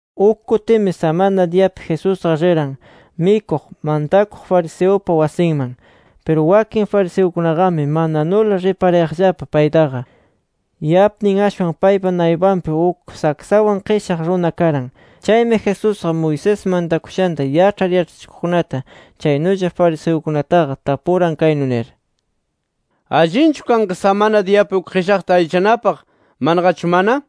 Uk kutimi samana diyapi Jesusqa riran mikuq, mantakuq fariseupa wasinman. Piru wakin fariseukunaqami mananula riparayaqllapa paytaqa. Yapnin ashwan paypa naypanpi uk saksawan qishaq runa karan. Chaymi Jesusqa, Moisés mantakushanta yaĉhar yaĉhachikuqkunata, chaynulla fariseukunataqa tapuran kaynu nir: —¿Allinchu kanqa samana diyapi uk qishaqta allichanapaq, manaqachu mana?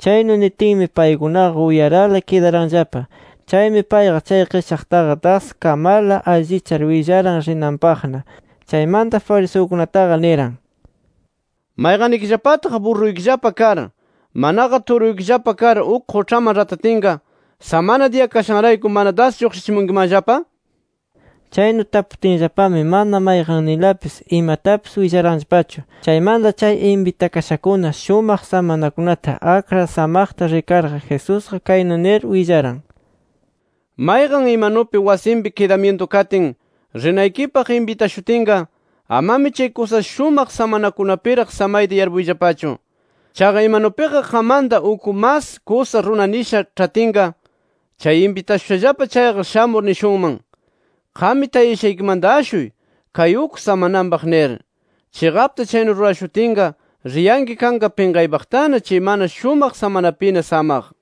Chaynu nitinmi, paykunaqa uyarala kidaranllapa. Chaymi payqa chay qishaqtaqa das kamarla allichar willaran rinanpaqna. Chaymanta fariseukunataqa niran: —¿Mayqannikillapataq burruykillapa kar, manaqa turuykillapa kar uk quĉhaman ratatinqa, samana diya kashanrayku mana das lluqshichinkimanllapa? Chaynu taputinllapami mana mayqanninlapis imatapis willaranllapachu. Chaymanta chay inbitakashakuna shumaq samanakunata akrar samaqta rikarqa, Jesusqa kaynu nir willaran: “Mayqan imanupi wasinpi kidamyintu katin, rinaykipaq inbitashutinqa, amami chay kusa shumaq samanakunapiraq samayta yarpuyllapachu. Chaqa imanupiqa qammanta uk mas kusa runa nisha ĉhatinqa, chay inbitashushallapa chayqa shamur nishunman: ‘Qam tayashaykimanta ashuy, kay uk samananpaq’ nir. Chiqapta chaynu rurashutinqa riyanki kanqa pinqaypaqtana chay mana shumaq samanapina samaq.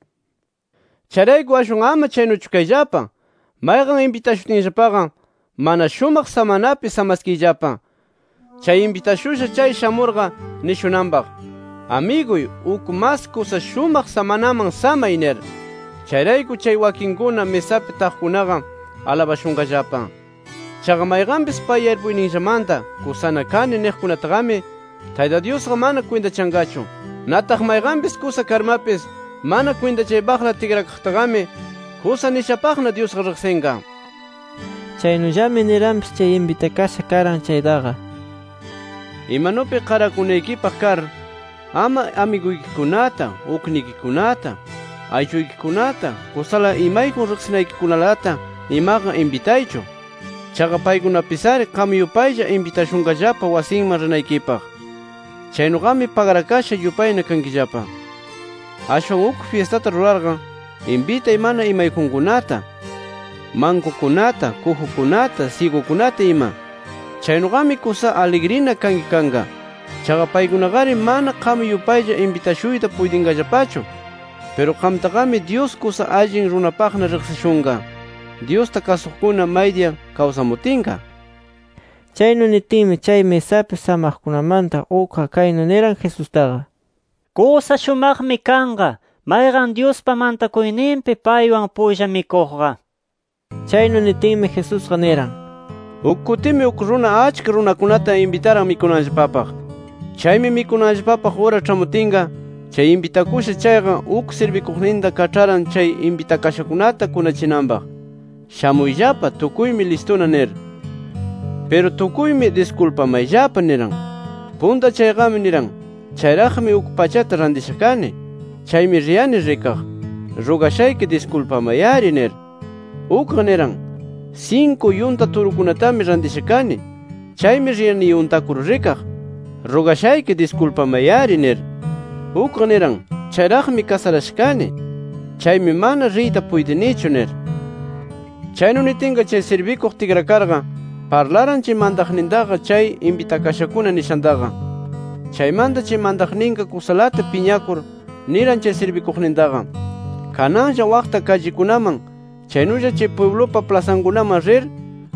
Chayrayku ashwan ama chaynuchu kayllapa. Mayqan inbitashutinllapaqa, mana shumaq samanapi samaskiyllapa, chay inbitashusha chay shamurqa nishunanpaq: ‘Amiguy uk mas kusa shumaq samanaman samay’ nir. Chayrayku chay wakinkuna misapi taqkunaqa alabashunqallapa. Chaqa mayqanpis pay yarpuyninllamanta ‘Kusana kani’ niqkunataqami Tayta Dyusqa mana kwintachanqachu. Nataq mayqanpis kusa karmapis mana kwintachaypaqla tikrakaqtaqami kusa nishapaqna Dyusqa riqsinqa”. Chaynullami niranpis chay inbitasha karan chaytaqa: “Imanupi qarakunaykipaq kar, ama amiguykikunata, uknikikunata, aylluykikunata, kusala imayjun riqsinaykikunalata imaqa, inbitaychu. Chaqa paykunapis-ari qam yupaylla inbitashunqallapa wasinman rinaykipaq. Chaynuqami pagrakasha yupayna kankillapa. Ashwan, uk fyistata rurarqa, inbitay mana imayjunkunata, mankukunata, kujukunata, syigukunata ima. Chaynuqami, kusa aligrina kanki kanqa. Chaqa paykunaqari mana qam yupaylla inbitashuyta puytinqallapachu. Piru qamtaqami Dyus kusa allin runapaqna riqsishunqa, Dyusta kasuqkuna maydiya kawsamutinqa”. Chaynu nitinmi, chay misapi samaqkunamanta ukqa kaynu niran Jesustaqa: —¡Kusa shumaqmi kanqa mayqan, Dyuspa mantakuyninpi paywan pulla mikuqqa! nir. Chaynu nitinmi, Jesusqa niran: “Uk kutimi uk runa achka runakunata inbitaran mikunanllapapaq. Chaymi mikunanllapapaq ura ĉhamutinqa, chay inbitakusha chayqa, uk sirbikuqninta kaĉharan chay inbitashankunata kunachinanpaq: ‘Shamuyllapa. Tukuymi listuna’ nir. “Piru tukuymi ‘Diskulpamayllapa’ niran. Punta chayqami niran: ‘Chayraqmi uk pachata rantisha kani. Chaymi riyani rikaq. Rugashayki diskulpamay-ari’ nir. “Ukqa niran: ‘Sinku yunta turukunatami rantisha kani. Chaymi riyani yuntakur rikaq. Rugashayki diskulpamay-ari’ nir. “Ukqa niran: ‘Chayraqmi kasarasha kani. Chaymi mana riyta puytinichu’ nir. “Chaynu nitinqa chay sirbikuq tikrakarqa parlaran chay mantaqnintaqa, chay inbitakashakuna nishantaqa. Chaymanta chay mantaqninqa kusalata piñakur niran chay sirbikuqnintaqa: ‘Kananlla waqta kallikunaman, chaynulla chay pwiblupa plasankunaman rir,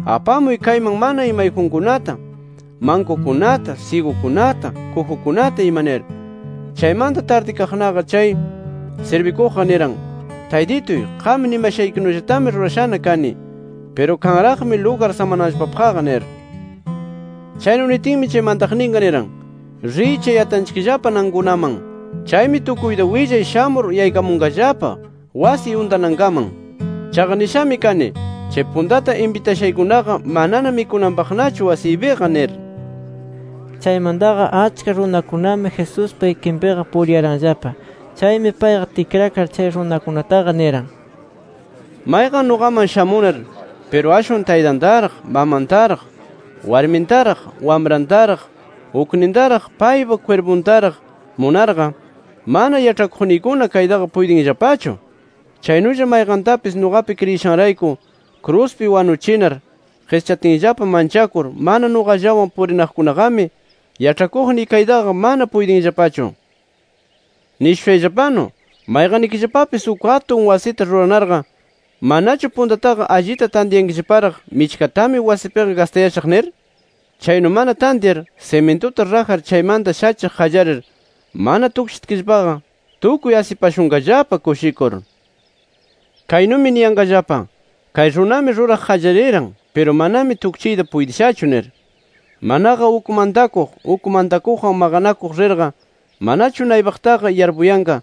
apamuy kayman mana imayjunkunata, mankukunata, syigukunata, kujukunata ima’ nir. “Chaymanta tardikaqnaqa chay sirbikuqqa niran: ‘Taytituy, qam nimashaykinullatami rurashana kani. Piru kanraqmi lugar samananllapapaqqa’ nir. “Chaynu nitinmi, chay mantaqninqa niran: ‘Riy chay yatanchikllapa nankunaman. Chaymi tukuyta willay shamur yaykamunqallapa wasiy untanankaman. Chaqa nishami kani, chay puntata inbitashaykunaqa manana mikunanpaqnachu wasiypiqa’ nir”. Chaymantaqa achka runakunami Jesuspa ikinpiqa puriranllapa. Chaymi payqa tikrakar chay runakunataqa niran: “Mayqan nuqaman shamunar piru ashwan taytantaraq, mamantaraq, warmintaraq, wamrantaraq, uknintaraq, paypa kwirpuntaraq munarqa, mana yaĉhakuqniykuna kaytaqa puytinllapachu. Chaynulla mayqantapis nuqapi kriyishanrayku kruspi wanuchinar qischatinllapa manchakur mana nuqallawan purinaqkunaqami, yaĉhakuqniy kaytaqa mana puytinllapachu. “Nishushayllapanu, mayqannikillapapis uk atun wasita ruranarqa, ¿manachu puntataqa alli tantyankillaparaq michkatami wasipiqa gastashaq nir? Chaynu mana tantyar, simintuta rajar chaymanta shachiq qallarir mana tukchitkillapaqa, tukuy asipashunqallapa kushikur. Kaynumi niyanqallapa: ‘Kay runami ruraq qallariran, piru manami tukchiyta puytishachu’ nir. “Manaqa uk mantakuq, uk mantakuqwan maqanakuq rirqa, ¿manachu naypaqtaqa yarpuyanqa: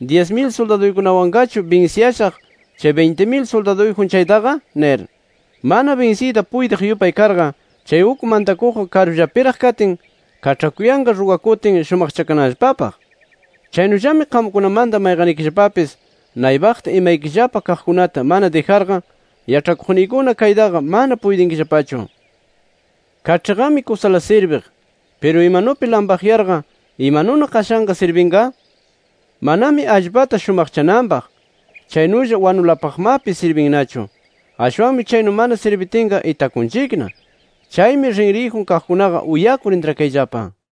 Dyis mil suldaduykunawanqachu binsiyashaq chay binti mil suldaduyjun chaytaqa, nir? Mana binsiyta puytiq yupay karqa, chay uk mantakuqqa karullapiraq katin, kaĉhakuyanqa rugakutin shumaqchakananllapapaq. Chaynullami qamkunamanta mayqannikillapapis naypaqta imaykillapa kaqkunata mana dijarqa, yaĉhakuqniykuna kaytaqa mana puytinkillapachu. “Kaĉhiqami kusala sirbiq. Piru imanupi lampaqyarqa, ¿imanuna qashanqa sirbinqa? Manami allpata shumaqchananpaq, chaynulla wanulapaqmapis sirbinnachu. Ashwanmi chaynu mana sirbitinqa itakunchikna. Chaymi rinriyjun kaqkunaqa uyakur intrakayllapa”.